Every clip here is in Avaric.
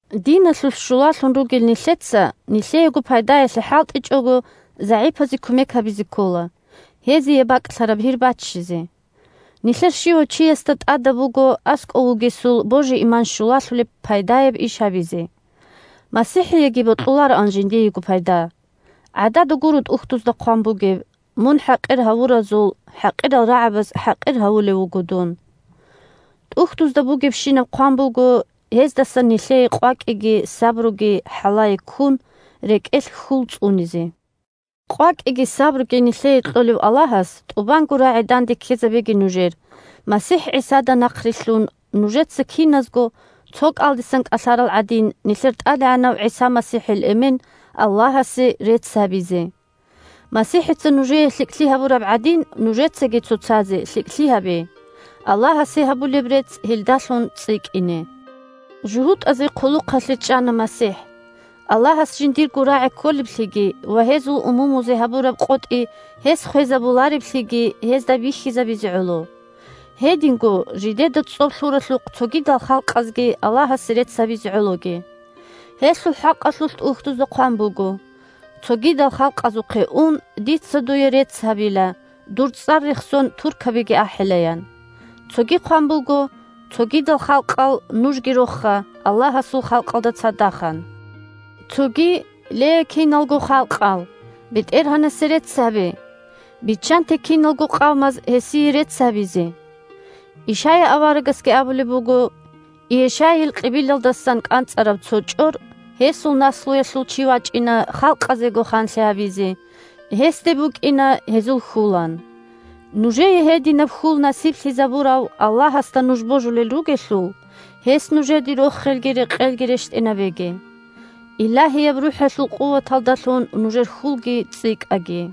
Диналъулъ щулалъун ругел нилъеца, нилъеего пайдаялъе хӀалтӀичӀого, загӀипазе кумек гьабизе ккола, гьезие бакӀлъараб гьир баччизе. Нилъер щивав чиясда тӀадаб буго аскӀов вугесул божи-иман щулалъулеб пайдаяб иш гьабизе. МасихӀиеги бокьулароан жиндиего пайда. ГӀадада гуро ТӀухьдузда хъван бугеб: «Мун хӀакъир гьавуразул хӀакъирал рагӀабаз хӀакъир гьавулев вуго дун». ТӀухьдузда бугебщинаб хъван буго, гьездасан нилъее къвакӀиги сабруги хӀалае ккун, рекӀелъ хьул цӀунизе. КъвакӀиги сабруги нилъее кьолев Аллагьас тӀубанго рагӀи данде ккезабеги нужер, МасихӀ ГӀисада нахърилълъун, нужеца киназго, цо кӀалдисан кӀалъарал гӀадин, нилъер ТӀадегӀанав ГӀиса МасихӀил Эмен – Аллагьасе рецц гьабизе. МасихӀица нужее лъикӀлъи гьабураб гӀадин, нужецаги цоцазе лъикӀлъи гьабе, Аллагьасе гьабулеб рецц гьелдалъун цӀикӀкӀине. ЖугьутӀазе хъулухъалъе чӀана МасихӀ, Аллагьас жиндирго рагӀи кколеблъиги ва гьезул умумузе гьабураб къотӀи гьес хвезабулареблъиги гьезда бихьизабизе гӀоло. Гьединго жидеда цӀоб лъуралъухъ цогидал халкъазги Аллагьасе рецц гьабизе гӀологи. Гьелъул хӀакъалъулъ ТӀухьдузда хъван буго: «Цогидал халкъазухъе ун, дица дуе рецц гьабила, дур цӀар рехсон, туркабиги ахӀила», – ян. Цоги хъван буго: «Цогидал халкъал, нужги роха Аллагьасул халкъалда цадахъ!» – ан. Цоги: «Ле, киналго халкъал, БетӀергьанасе рецц гьабе! Биччанте киналго къавмаз гьесие рецц гьабизе!» Ишая аварагасги абулеб буго: «Иешайил кьибилалдасан кӀанцӀараб цо чӀор, гьесул наслуялъул чи вачӀина халкъазего ханлъи гьабизе, гьесде букӀина гьезул хьул», – ан Нужее гьединаб хьул насиблъизабурав Аллагьасда нуж божулел ругелъул, гьес нужеде рохелги рекъелги рещтӀинабеги. Илагьияб РухӀалъул къуваталдалъун нужер хьулги цӀикӀкӀаги.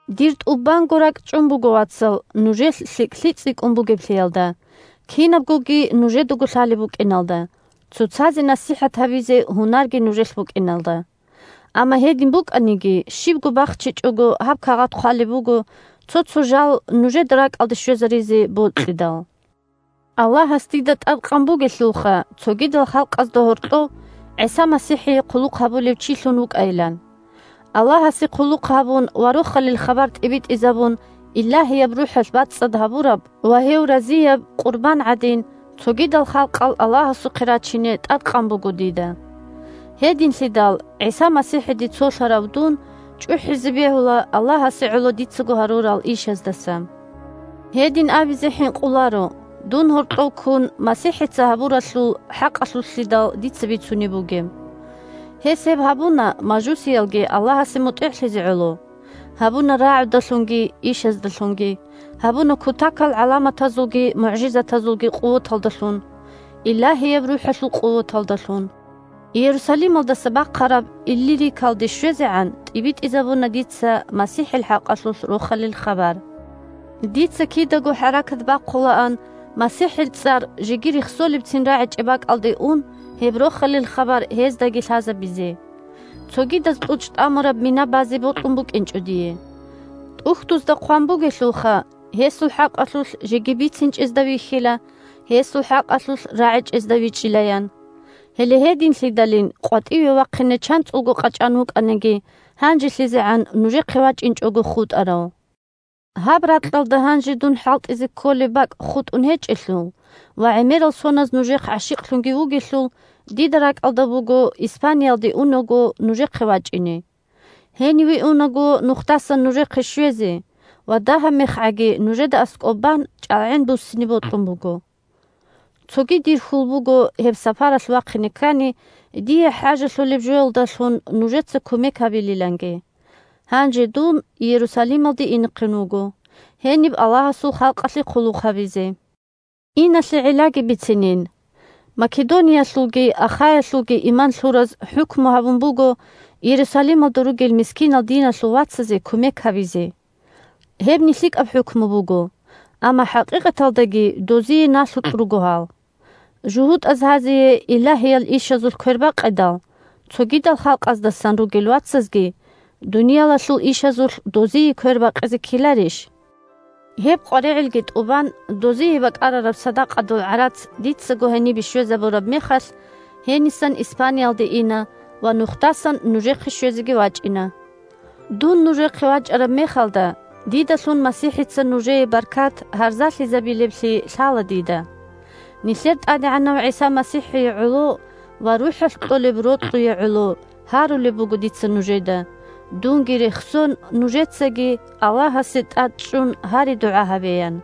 Дир тӀубанго ракӀчӀун буго, вацал, нужелъ лъикӀлъи цӀикӀкӀун бугеблъиялда, кинабгоги нужедаго лъалеб букӀиналда, цоцазе насихӀат гьабизе гьунарги нужелъ букӀиналда. Амма гьедин букӀаниги, щибго бахчичӀого, гьаб кагъат хъвалеб буго, цо-цо жал нужеда ракӀалде щвезаризе бокьидал. Аллагьас дида тӀадкъан бугелъулха цогидал халкъазда гьоркьов ГӀиса МасихӀие хъулухъ гьабулев чилъун вукӀайилан. Аллагьасе хъулухъ гьабун ва Рохалил хабар тӀибитӀизабун Илагьияб РухӀалъ бацӀцӀад гьабураб ва гьев разияб къурбан гӀадин, цогидал халкъал Аллагьасухъе рачине тӀадкъан буго дида. Гьединлъидал, ГӀиса МасихӀиде цолъарав дун чӀухӀизе бегьула Аллагьасе гӀоло дицаго гьарурал ишаздаса. Гьедин абизе хӀинкъуларо, дун гьоркьов ккун, МасихӀица гьабуралъул хӀакъалъулълъидал дица бицунеб бугеб. Гьес гьеб гьабуна мажусиялги Аллагьасе мутӀигӀлъизе гӀоло, гьабуна рагӀудалъунги ишаздалъунги, гьабуна кутакал гӀаламатазулги мугӀжизатазулги къуваталдалъун, Илагьияб РухӀалъул къуваталдалъун. Иерусалималдаса бахъараб Иллирикалде щвезегӀан тӀибитӀизабуна дица МасихӀил хӀакъалъулъ Рохалил хабар. Дица кидаго хӀаракат бахъулаан, МасихӀил цӀар жеги рехсолебцин рагӀичӀеб бакӀалде ун, гьеб Рохалил хабар гьездаги лъазабизе. Цогидаз кьучӀ тӀамураб мина базе бокьун букӀинчӀо дие. ТӀухьдузда хъван бугелъулха: «Гьесул хӀакъалъулъ жеги бицинчӀезда вихьила, гьесул хӀакъалъулъ рагӀичӀезда вичӀчӀила», – ян. Гьеле гьединлъидалин, къватӀиве вахъине чанцӀулго къачӀан вукӀаниги, гьанжелъизегӀан нужехъе вачӀинчӀого хутӀарав. Гьаб ракьалда гьанже дун хӀалтӀизе кколеб бакӀ хутӀун гьечӀелъул ва гӀемерал соназ нужехъ гӀащикълъунги вугелъул, дида ракӀалда буго, Испаниялде унаго нужехъе вачӀине. Гьениве унаго нухдасан нужехъе щвезе, ва дагьаб мехгӀаги нужеда аскӀоб бан, чӀалгӀен буссине бокьун буго. Цоги, дир хьул буго гьеб сапаралъ вахъине ккани дие хӀажалъулеб жоялдалъун нужеца кумек гьабилиланги. Гьанже дун Иерусалималде инехъин вуго, гьениб Аллагьасул халкъалъе хъулухъ гьабизе. Иналъе гӀиллаги бицинин: Македониялъулги Ахаялъулги иман лъураз хӀукму гьабун буго Иерусалималда ругел мискинал диналъул вацазе кумек гьабизе. Гьебни лъикӀаб хӀукму буго, амма хӀакъикъаталдаги дозие налъукь руго гьал. ЖугьутӀаз гьазие илагьиял ишазулъ квербакъидал, цогидал халкъаздасан ругел вацазги дуниялалъул ишазулъ дозие квербакъизе ккеларищ? Гьеб къваригӀелги тӀубан, дозие бакӀарараб садакъадул гӀарац дицаго гьенибе щвезабураб мехалъ, гьенисан Испаниялде ина ва нухдасан нужехъе щвезеги вачӀина. Дун нужехъе вачӀараб мехалда, дидалъун МасихӀица нужее баркат гьарзалъизабилеблъи лъала дида. Нилъер ТӀадегӀанав ГӀиса МасихӀие гӀоло ва РухӀалъ кьолеб рокьуе гӀоло гьарулеб буго дица нужеда, дунги рехсон, нужецаги Аллагьасе тӀадчӀун гьари-дугӀа гьабеян.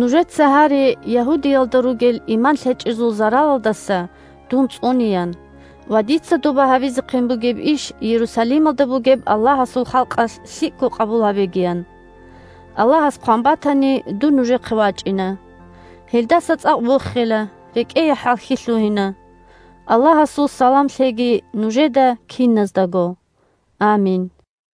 Нужеца гьаре Ягьудиялда ругел иман лъечӀезул заралалдаса дун цӀунеян ва дица доба гьабизехъин бугеб иш Иерусалималда бугеб Аллагьасул халкъалъ лъикӀго къабул гьабегиян. Аллагьас хъван батани, дун нужехъе вачӀина. Гьелдаса цӀакъ вохила, рекӀее хӀалхьи лъугьина. Аллагьасул салам лъеги нужеда киназдаго. Амин.